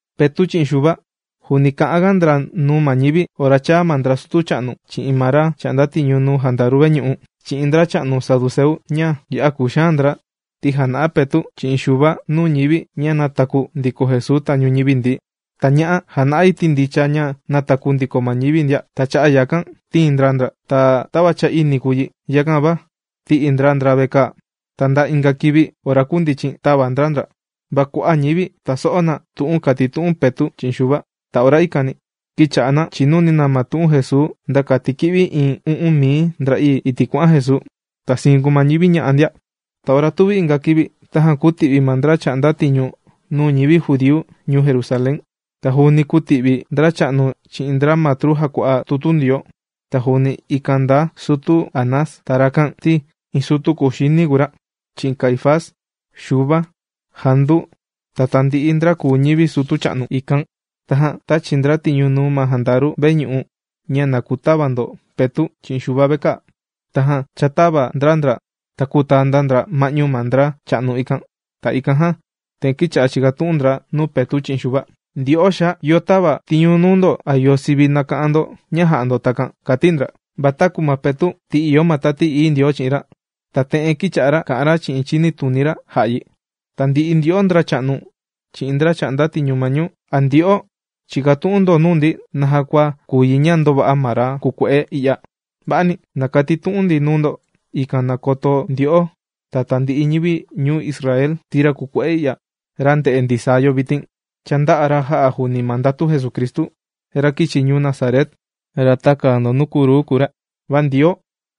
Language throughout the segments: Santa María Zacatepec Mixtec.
Petu' chi'in Xuva juuni kà'anga ndra nuu ma ñivi, ora chāa ma ndra sutu cha'nu chi'in ma ra chà'nda tiñu nuu jandaru veñu'u, chi'in ndracha'nu saduceu ña ya'a kùxaan ndra, ti jàna'a Petu' chi'in Xuva nuu ñivi ña nātaku ndiko Jesuu tañu ñivi ndií. Ta ña'a jàna'a yi ti ndicha ña nàtaku ndiko ma ñivi ndia. Ta cha'a' yakan tīin ndra ndra. Ta tava cha ini kùu yi, yakan va, tī'i ndra ndra vekaa. Ta nda inga kivi ora kundichin tāva ndra ndra. Va kua'a' ñivi tàso'o na tu'un kàtitu'un Petu' chi'in Xuva. Ta ora ikani kīcha'a na chìnuni na tu'un Jesuu nda kati kī'vi iin u'un mii ndra'ii, iti' kuà'an Jesuu. Ta siin kùu ma ñivi ña'a' ndia. Ta ora tuvi inga kivi, tajan kūti'vi ma ndra chà'nda tiñu nuu ñivi judíu ñuu Jerusalén, ta juuni kūti'vi ndracha'nu chi'in ndra matru jàkua'a tutu Ndioo. Ta juuni ikan ndaa sutu Anás. Ta rakan ti, iin sutu kuxini kùu ra, chi'in Caifás, Xuva, Jandu, ta tandi'i ndra kùu ñivi sutu cha'nu ikan. Tajan tāchi ndra tiñu nuu ma jandaru veñu'u ña na kutava ndra Petu' chi'in Xuva vekaa. Tajan chātava ndra ndra ta kūtaa ndra ndra ma'ñu ma ndra cha'nu ikan. Ta ikan jan te'en kīcha'a chìkatu'un ndra nuu Petu' chi'in Xuva: ―Ndyo'o xaa, ¿yo tāva tiñu nuu ndo a yo sivi nàka'an ndo ña jà'a ndo takan? ―kàti ndra. Va taku ma Petu', ti ìyo ma Tati Ií Ndioo chi'in ra, ta te'en kīcha'a kà'an ra chi'in chinituni ra jā'a yi: ―Tandi'i ndyo'o ndracha'nu chi'in ndra chà'nda tiñu ma ñuu. ¿A ndyo'o, chìkatu'un ndo nuu ndi naja kua kùu yi ña ndōva'a ma ra kùkue'e i'ya? Va'ani. Na katitu'un ndi nuu ndo, ikan na koto ndyo'o, ta tandi'i ñivi ñuu Israel, ti ra kùkue'e i'ya, ra ndè'e ndisaa yo vitin, cha ndā'a ra jā'a juuni ma ndatu Jesucristu, ra kīchi ñuu Nazaret, ra tākaa ndo nuu kruu kùu ra. Va Ndioo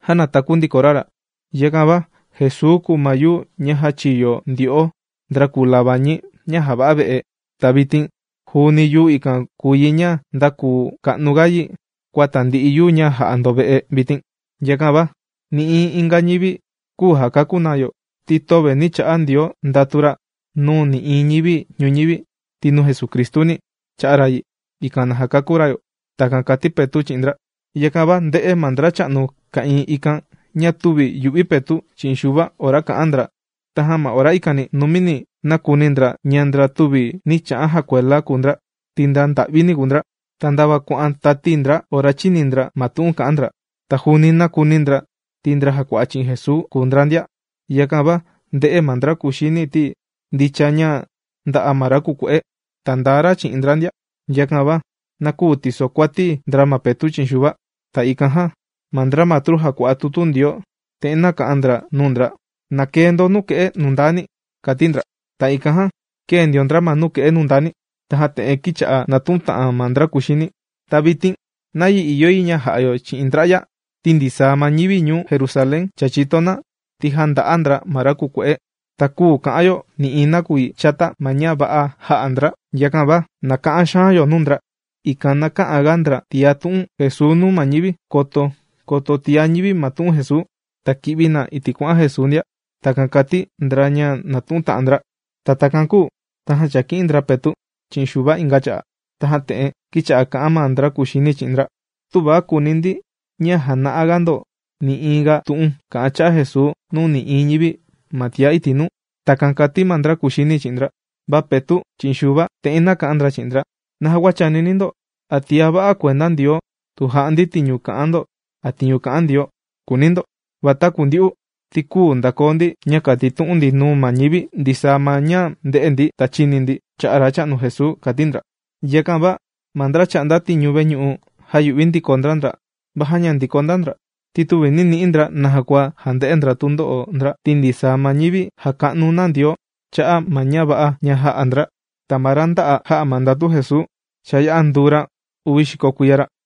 jānataku ndiko ra ra. Yakan va Jesuu kùu ma yuu ña jāchiyo ndyo'o ndra kùu labañi ña jàva'a ve'e. Ta vitin juuni yuu ikan kùu yi ña ndākuu ka'nuga yi kua tandi'i yuu ña jà'a ndo ve'e vitin. Yakan va nï'iin inga ñivi, küu jàkakú na yo, ti töve nī cha'a Ndioo ndatu ra nuu nï'iin ñivi ñuñivi, ti nuu Jesucristuni, chā'a ra yi, ikan na jakakú ra yo. ―Takan kàti Petu' chi'in ndra. Yakan va ndē'e ma ndracha'nu ka'ìin ikan ña tüvi yu'vi Petu' chi'in Xuva ora kà'an ndra. Tajan ma ora ikani, numini nākuni ndra ña ndra tüvi nī cha'an jakuela kùu ndra, ti ndra nda'vini kùu ndra. Ta ndava kuà'an tati ndra ora chīni ndra ma tu'un kà'an ndra. Ta juuni nākuni ndra, ti ndra jàkua'a chi'in Jesuu kùu ndra ndia. Yakan va ndē'e ma ndra kuxini ti, ndicha ña ndā'a ma ra kùkue'e. Ta ndaa ra chi'in ndra ndia, yakan va, na küu tisokuati ndra ma Petu' chi'in Xuva. Ta ikan jan, ma ndra matru jàkua'a tutu Ndioo, te'en nāka'an ndra nuu ndra: ―¡Na kee ndo ma nuke'e nundani! ―kàti ndra. Ta ikan jan, kēe ndio ndra ma nuke'e nundani. Tajan te'en kīcha'a nàtu'un ta'an ma ndra kuxini: ―¿Ta vitin, nayi ìyo yi ña ja'a yo chi'in ndra'ya? Ti ndisaa ma ñivi ñuu Jerusalén cha chìto na, ti jānda'a ndra ma ra kùkue'e. Ta küu ka'an yo nï'iin nakuyi chata ma ña va'a jā'a ndra. Yakan va na ka'an xaan yo nuu ndra, ikan na kä'an ga ndra tiá tu'un Jesuu nuu ma ñivi, koto koto tiá ñivi ma tu'un Jesuu, ta ki'vi na iti' kuà'an Jesuu ndia. ―Takan kàti ndra ña nàtu'un ta'an ndra. Ta takan kūu tajan chāki'in ndra Petu' chi'in Xuva inga cha'a', tajan te'en kīcha'a kà'an ma ndra kuxini chi'in ndra: ―¡Tuva kùuni ndi ña jana'aga ndo, nï'iin ga tu'un kà'an cha'a' Jesuu nuu nï'iin ñivi ma tiá iti' nuu! ―Takan kàti ma ndra kuxini chi'in ndra. Va Petu' chi'in Xuva, te'en nāka'an ndra chi'in ndra: ―¿Naja kua chànini ndo, a tiá va'a kuenda Ndioo tu jà'a ndi tiñu kà'an ndo a tiñu kà'an Ndioo?, kùuni ndo. Va taku ndyu'u, ti küu ndakoo ndi ña kàtitu'un ndi nuu ma ñivi ndisaa ma ña ndē'e ndi ta chīni ndi cha'a' Racha'nu Jesuu ―kàti ndra. Yakan va ma ndra chà'nda tiñu veñu'u jāyu'vi ndiko ndra ndra, va jāña ndiko ndra ndra. Ti tüvi nī ni'i ndra naja kua jande'e ndra tundo'o ndra, ti ndisaa ma ñivi jàka'nu na Ndioo cha'a' ma ña va'a ña jā'a ndra. Ta ma ra ndā'a jā'a ma ndatu Jesuu, cha yā'a nduu ra uvi xiko kuiya ra.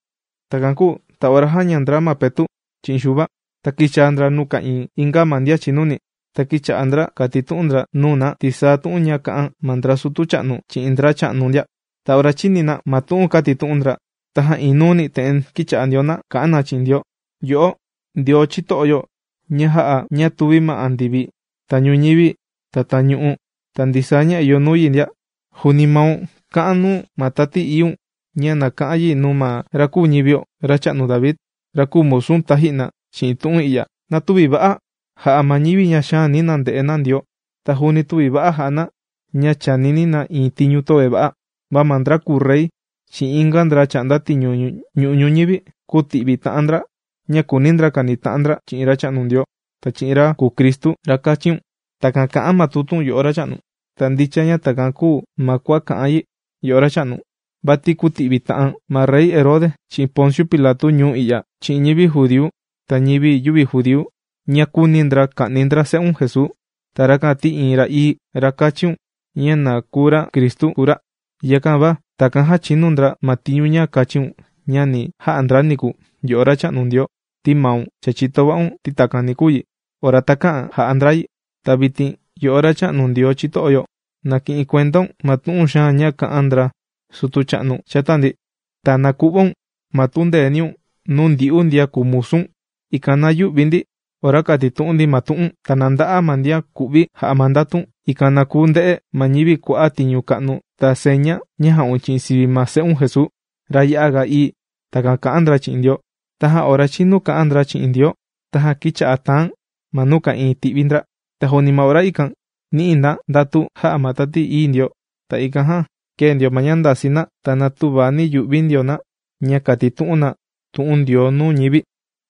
Takan kūu ta ora jāña ndra ma Petu' chi'in Xuva, ta kīchaa ndra nuu ka'ìin inga ma ndian chìnuni. Ta kīcha'a ndra kàtitu'un ndra nuu na ndisaa tu'un ña kā'an ma ndra sutu cha'nu chi'in ndracha'nu ndia. Ta ora chīni na ma tu'un kātitu'un ndra, tajan iin nuuni te'en kīcha'a ndio na kà'an na chi'in Ndioo: ―Yo'o, Ndioo chito'o yo, ña jā'a ña tūvi ma andivi ta ñuñivi ta tañu'u ta ndisaa ña ìyo nuu yi ndia. Juuni maun, kā'an nuu ma Tati Iíun ña na ka'an yi nuu ma ra kūu ñivio, racha'nu David, ra kūu musu̱n taji'na chi'in tu'un i'ya: ¡Na tüvi va'a jà'a ma ñivi ña xaani na nde'e na Ndioo, ta juuni tüvi va'a jà'a na, ña chànini na iin tiñu ña töve va'a! Va ma ndra kùu rey chi'in inga ndra chà'nda tiñu nuu ñu'u' ñuñivi, kūti'vi ta'an ndra ña kùuni ndra kanita'an ndra chi'in Racha'nu Ndioo, ta chi'in ra kùu Cristu, ra kāchiun. Takan kà'an ma tutu̱n, yo'o Racha'nu. ’Ta ndicha ña takan kūu ma kua kà'an yi, yo'o Racha'nu. Vati kūti'vi ta'an ma Rey Herode chi'in Ponciu Pilatu ñuu i'ya, chi'in ñivi judíu ta ñivi yüvi judíu, ña kūuni ndra ka'ni ndra se'un Jesuu, ta rakan ti iin ra ií, ra kāchiun ña na kùu ra Cristu, kùu ra. Yakan va takan jāchinu ndra ma tiñu ña kāchiun ña ni ja'a ndra niku, yo'o Racha'nu Ndioo, ti maun, cha chìto va'un, ti takan ni kuu yi, ora takä'an ja'a ndra yi. Ta vitin, yo'o Racha'nu Ndioo chito'o yo, ¡na ki'in kuendaun ma tu'un xaan ña kā'an ndra sutu cha'nu chata ndi! ¡Ta na ku'vaun, ma tundeeniun nuu ndyu'u ndian kùu musu̱n, ikan na yü'vi ndi ora kàtitu'un ndi ma tu'u̱n! Ta na nda'a ma ndian ku'vi jà'a ma ndatun, ikan na kuu nde'e ma ñivi kua'a' tiñu ka'nu ta seña ña jà'un chi'in sivi ma se'un Jesuu, ra ya'a ga ií. ―Takan kà'an ndra chi'in Ndioo. Tajan ora chīnu ña kā'an ndra chi'in Ndioo, tajan kīcha'a tàan ma nuu ka'ìin ti'vi ndra. Ta juuni ma ora ikan, nī'i na ndatu, jā'a ma Tati Ií Ndioo. Ta ikan jan, kēe ndio ma ña ndasii na, ta na tüva yu'vi ndio na, ña kàtitu'un na tu'un Ndioo nuu ñivi.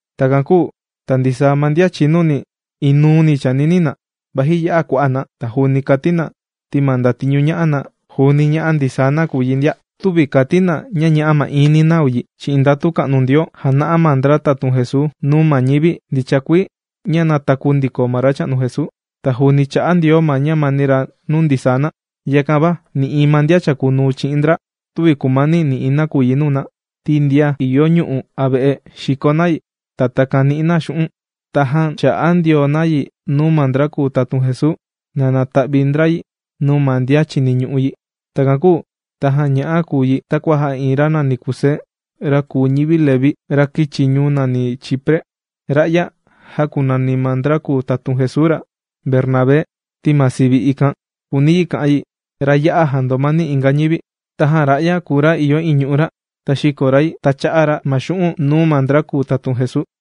Takan kūu ta ndisaa ma ndian chìnuni inuuni chànini na, vaji ya'a kua'a' na. Ta juuni kàti na ti ma ndatiñu ñà'a na juuni ñà'a ndisaa na kùu yi ndia. Tüvi kàti na ña ñà'a ma'iin na kùu yi. Chi'in ndatu ka'nu Ndioo, jàna'a ma ndra tatun Jesuu, nuu ma ñivi ña ndicha kuii ña nātaku ndiko Racha'nu Jesuu. Ta juuni chà'a Ndioo ma ñamani ra nuu ndisaa na. Yakan va nï'iin ma ndian chàkunuu chi'in ndra, tüvi kùmani nï'iin nakuyi nuu na. Ti ndian ìyo ñu'u' a ve'e, xìko na yi, ta takan nì'i na xu'un', tajan chà'a ndio na yi nuu ma ndra kùu tatun Jesuu, na nata'vi ndra yi nuu ma ndian chìniñu'u yi. Takan kūu tajan ña'a kùu yi takua jā'a iin ra nàni Kusé, ra kùu ñivi Leví, ra kīchi ñuu nàni Chipre. Ra'ya, jākunani ma ndra tatun Jesuu ra, Bernabé, ti ma sivi ikan kùuni yi kà'an yi: Ra ya'a jàndomani inga ñivi. Tajan ra'ya kùu ra ña ìyo iin ñu'u' ra, ta xīko ra yi, ta chā'a ra ma xu'un' nuu ma ndra kùu tatun Jesuu.